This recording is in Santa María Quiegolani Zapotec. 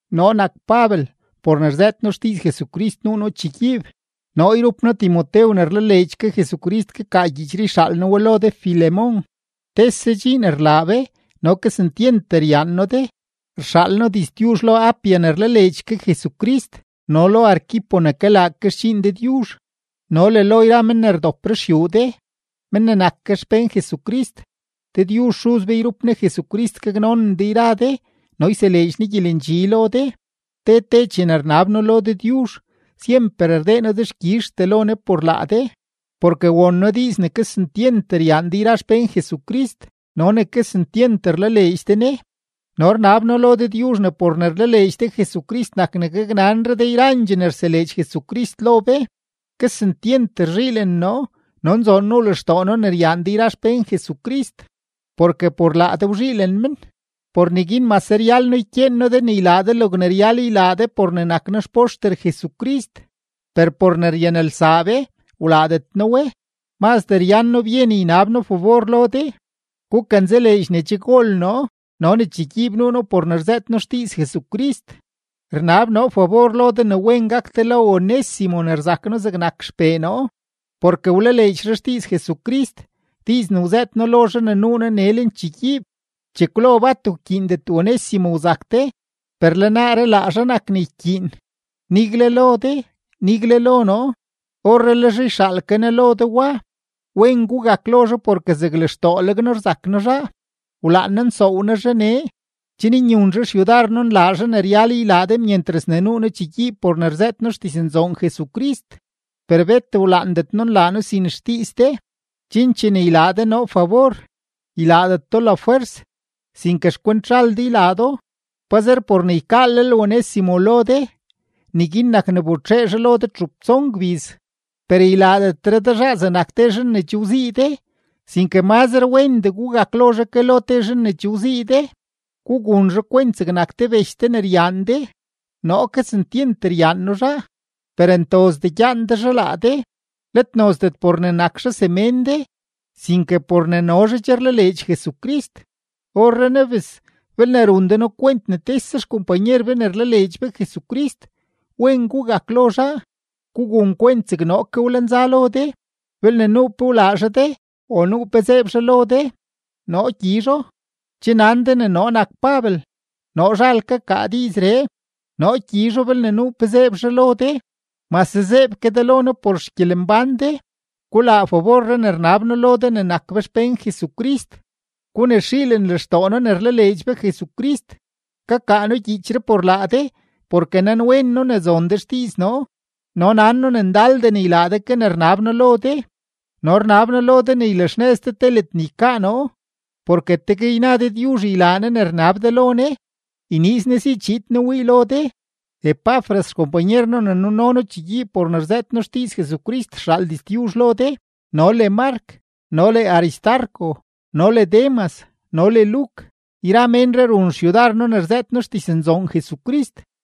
Noo nak Pabel; por ne rzëët noo xdiiz Jesucrist nuu noo chegyiib. Noo yrup noo Timotew ne rlaleedx ke Jesucrist kakaa gyiichree yxaal noo we lo de Filemón, tese dxiin rlaa be no kesentyent ryaan noo de. Rxaal noo diztyuzh lo Apia ne rlaleedx ke Jesucrist no le lo Arquipo ne kalaa ke xdxiin Dëdyuzh, no le lo yra men ne rdop ruxyuu de, men ne nak ke xpén Jesucrist. Dëdyuzh Xuz be yrup Ne Jesucrist gaknonen de yra de no yseleedx Ne gyelendxi lo de. Te te chene rnab noo lo Dëdyuzh, syemper rdee noo dexkyizhtee lo Ne por laa de, porke won noo diiz ne kesentyent ryaan de yra xpén Jesucrist no ne kesentyent rlaleedx de Ne. No rnab noo lo Dëdyuzh ne por ne rlaleedx de Jesucrist nak ne gaknanre de yrandxee ne rseleedx Jesucrist lo be. Kesentyent rzhiilen noo no nzoon nuu lextoo noo ne ryaan de yra xpén Jesucrist, porke por laa de wzhiilen men. Por neguin mase ryal noo ykyeen noo de ne ylaa de logne ryal ylaa de por ne nak noo xpoxter Jesucrist, per por ne ryanelsaa be, wlaadet noo we, mazdee ryan noo byen ynab noo fabor lo de. Gukanzaleedx ne che gol noo no ne chegyiib nuu noo por ne rzëët noo xdiiz Jesucrist. Rnab noo fabor lo de ne wen gak de lo Onésimo ne rzak noo zegnak xpee noo, porke wlaleedx zhaa xdiiz Jesucrist, diiz ne wzëët noo lo zhaa ne nuu noo nee lenchegyiib. Chekwlo bat wkyiindet Onésimo wzak de, per le naaree laa zhaa nak ne ykyiin, nigle lo de, nigle lo noo. Orrenaa le zhaa yxaal ke noo lo de wa; wen gugak lo zhaa porke zeg lextooleg noo rzak noo zhaa. Wlaan noo nsoow noo zhaa nee, chen nyun zhaa xyudar noo nlaa zhaa ne ryal ylaa de myentras ne nuu noo chegyiib por ne rzëët noo xdiznzoon Jesucrist. Per bet wlaandet noo nlaa noo sin xdiiz de, chen chene ylaa de noo fabor, ylaadet do lafwers, sinke xkwent zhal de ylaa do. Pazer por ne ykaalel Onésimo lo de, neguin nak ne wbetxee zhaa lo de txup tson gbiz. Per ylaadetre de zhaa zegnak te zhan ne che wzii de, sinke mazre wendee gugak lo zhaa ke lo te zhan ne che wzii de; gugun zhaa kwent zegnak te bech de ne ryaan de. Noo kesentyent ryaan noo zhaa, per ntozdee gyaan de zhaa laa de, let nozdet por ne nak zhaa semén de, sinke por ne no zhaa che rlaleedx Jesucrist. Orrenaa bes, belne run de noo kwent ne tese xkompanyer be ne rlaleedx be Jesucrist, wen gugak lo zhaa, gugun kwent zeg noo ke wlenza lo de. Belne nuu pe wlaa zhaa de o nuu pe zeeb zhaa lo de, noo gyizho. Che nan de ne noo nak Pabel, noo zhal kakaa diizree; noo gyizho belne nuu pe zeeb zhaa lo de, mase zeeb ke de lo noo por xgyelembán de. Gulaa faborree ne rnab noo lo de ne nak be xpén Jesucrist. Gunexiilen lextoo noo ne rlaleedx be Jesucrist. Kakaa noo gyiichree por laa de, porke nanwen noo ne zon de xdiiz noo, no nan noo ne ndaldee ne ylaa de ke ne rnab noo lo de. No rnab noo lo de ne ylaxnëz de te ledne ykaa noo, porke tegue yna Dëdyuzh ylaa Ne ne rnab de lo Ne, yniiz Ne si chiid noo wii lo de. Epafras xkompanyer noo ne nuno noo chegyiib por ne rzëët noo xdiiz Jesucrist rxaal diztyuzh lo de no le Mark no le Aristarco no le Demas no le Luk. Yra ménree run xyudar noo ne rzëët noo xdiznzoon Jesucrist.